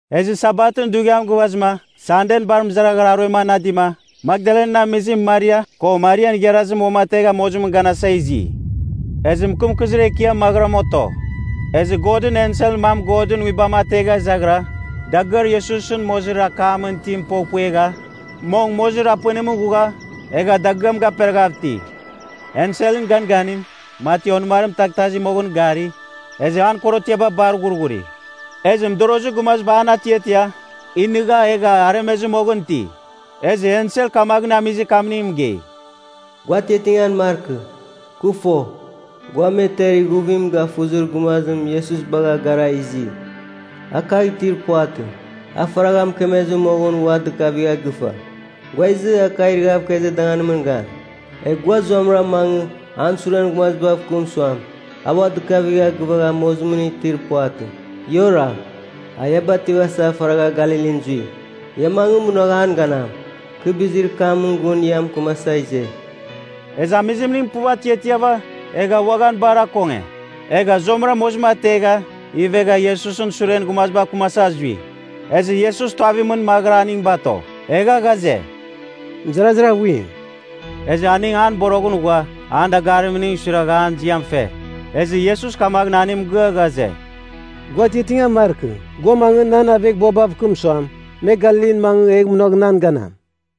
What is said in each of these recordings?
Ezɨ Sabatɨn dughiam gɨvazɨma, Sanden bar mɨzaraghara aruem anadima, Makdalan amizim Maria, ko Marian igharazim uamategha mozimɨn ganasa izi. Ezɨ mɨkɨmkɨzir ekiam maghɨram oto. Ezɨ Godɨn enselɨn mam Godɨn Nguibam ategha izaghɨra, dagɨar Iesusɨn mozir akamɨn itim poghpuegha, mong mozir apɨnimɨn ghugha, egha dagɨam gaperaghav iti. Enselɨn ganganim, mati onɨmarim taghtazi moghɨn gari, ezɨ an korotiaba bar ghurghuri. Ezɨ mɨdorozir gumaziba an atiatia, inɨgha egha aremezɨ moghɨn iti. Ezɨ ensel kamaghɨn amizir kamning mɨgei, “Gua atiatingan markɨ. Kɨ fo, gua me ter ighuvim gafuzir gumazim Iesus bagha gara izi. A kagh itir puvatɨ. A faragha mɨkemezɨ moghɨn ua dɨkavigha gɨfa. Gua izɨ, a kagh irɨghav ikezir danganimɨn gan. “Egh gua zuamɨra mangɨ, an suren gumazibav kɨm suam, a ua dɨkavigha gɨvagha mozimɨn itir puvatɨ. Ia oragh. A ia bativasa faragha Galilin zui. Ia mangɨ, munagh an ganam. Kɨ bizir kamɨn gun gua mɨkɨmasa ize.” Ezɨ amizimning puv atiatiava, egha uaghan bar akonge. Egha zuamɨra mozim ategha, ivegha Iesusɨn suren gumazibav kɨmasa zui. Ezɨ Iesus tuavimɨn maghɨra aning bato, egha ghaze, “Mɨzarazir aghuim.” Ezɨ aning an boroghɨn ghua, an dagarimning suiragha an ziam fe. Ezɨ Iesus kamaghɨn aning mɨgɨa ghaze, “Gua atiatingan markɨ. Gua mangɨ, nan aveghbuabav kɨm suam, me Galilin mangɨ egh munagh nan ganam.”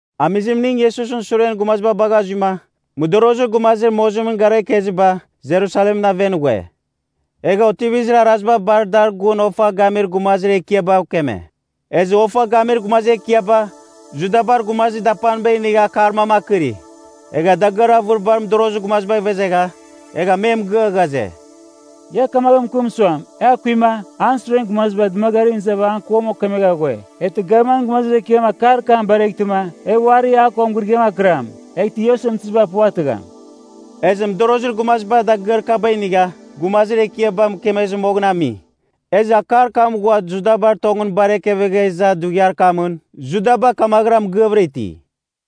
Amizimning Iesusɨn suren gumaziba bagha zuima, mɨdorozir gumazir mozimɨn gara ikeziba Jerusalemɨn aven ghue. Egha otivizir araziba bar dar gun ofa gamir gumazir ekiabav keme. Ezɨ ofa gamir gumazir ekiaba, Judabar gumazir dapaniba inigha akar mam akɨri. Egha dagɨar avɨribar mɨdorozir gumazibagh ivezegha, egha me mɨgɨa ghaze, “Ia kamaghɨn mɨkɨm suam, e akuima, an suren gumaziba dɨmagarimɨn izava an kuam okemegha ghue. Eghtɨ gavmanɨn gumazir ekiam akar kam bareghtɨma, e uari a ko mɨgɨrɨgɨam akɨram, eghtɨ ia osɨmtɨziba puvatɨgham.” Ezɨ mɨdorozir gumaziba dagɨar kaba inigha, gumazir ekiaba mɨkemezɨ moghɨn ami. Ezɨ akar kam ghua Judabar tongɨn bar ekefegha iza dughiar kamɨn, Judaba kamaghɨra mɨgɨavɨra iti.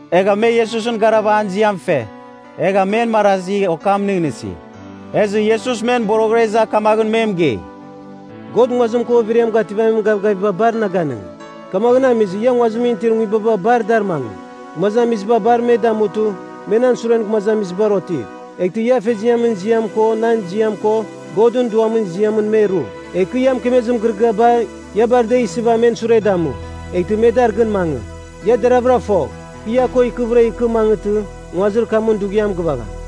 Egha me Iesusɨn garava an ziam fe, egha men marazi okam nɨghnɨsi. Ezɨ Iesus men boroghɨra iza kamaghɨn me mɨgei, “God nguazim ko overiam gativamin gavgaviba bar na ganɨngi. Kamaghɨn amizɨ, ia nguazimɨn itir nguibaba bar dar mangɨ, gumazamiziba bar me damutɨ, me nan suren gumazamizibar otiv. Eghtɨ ia Afeziamɨn ziam ko, nan ziam, ko Godɨn Duamɨn ziamɨn me ru. Egh kɨ ia mɨkemezir mɨgɨrɨgɨaba, ia bar da isɨva men sure damu, eghtɨ me dar gɨn mangɨ. Ia deravɨra fogh, kɨ ia ko ikɨvɨra ikɨ mangɨtɨ, nguazir kamɨn dughiam gɨvagham.”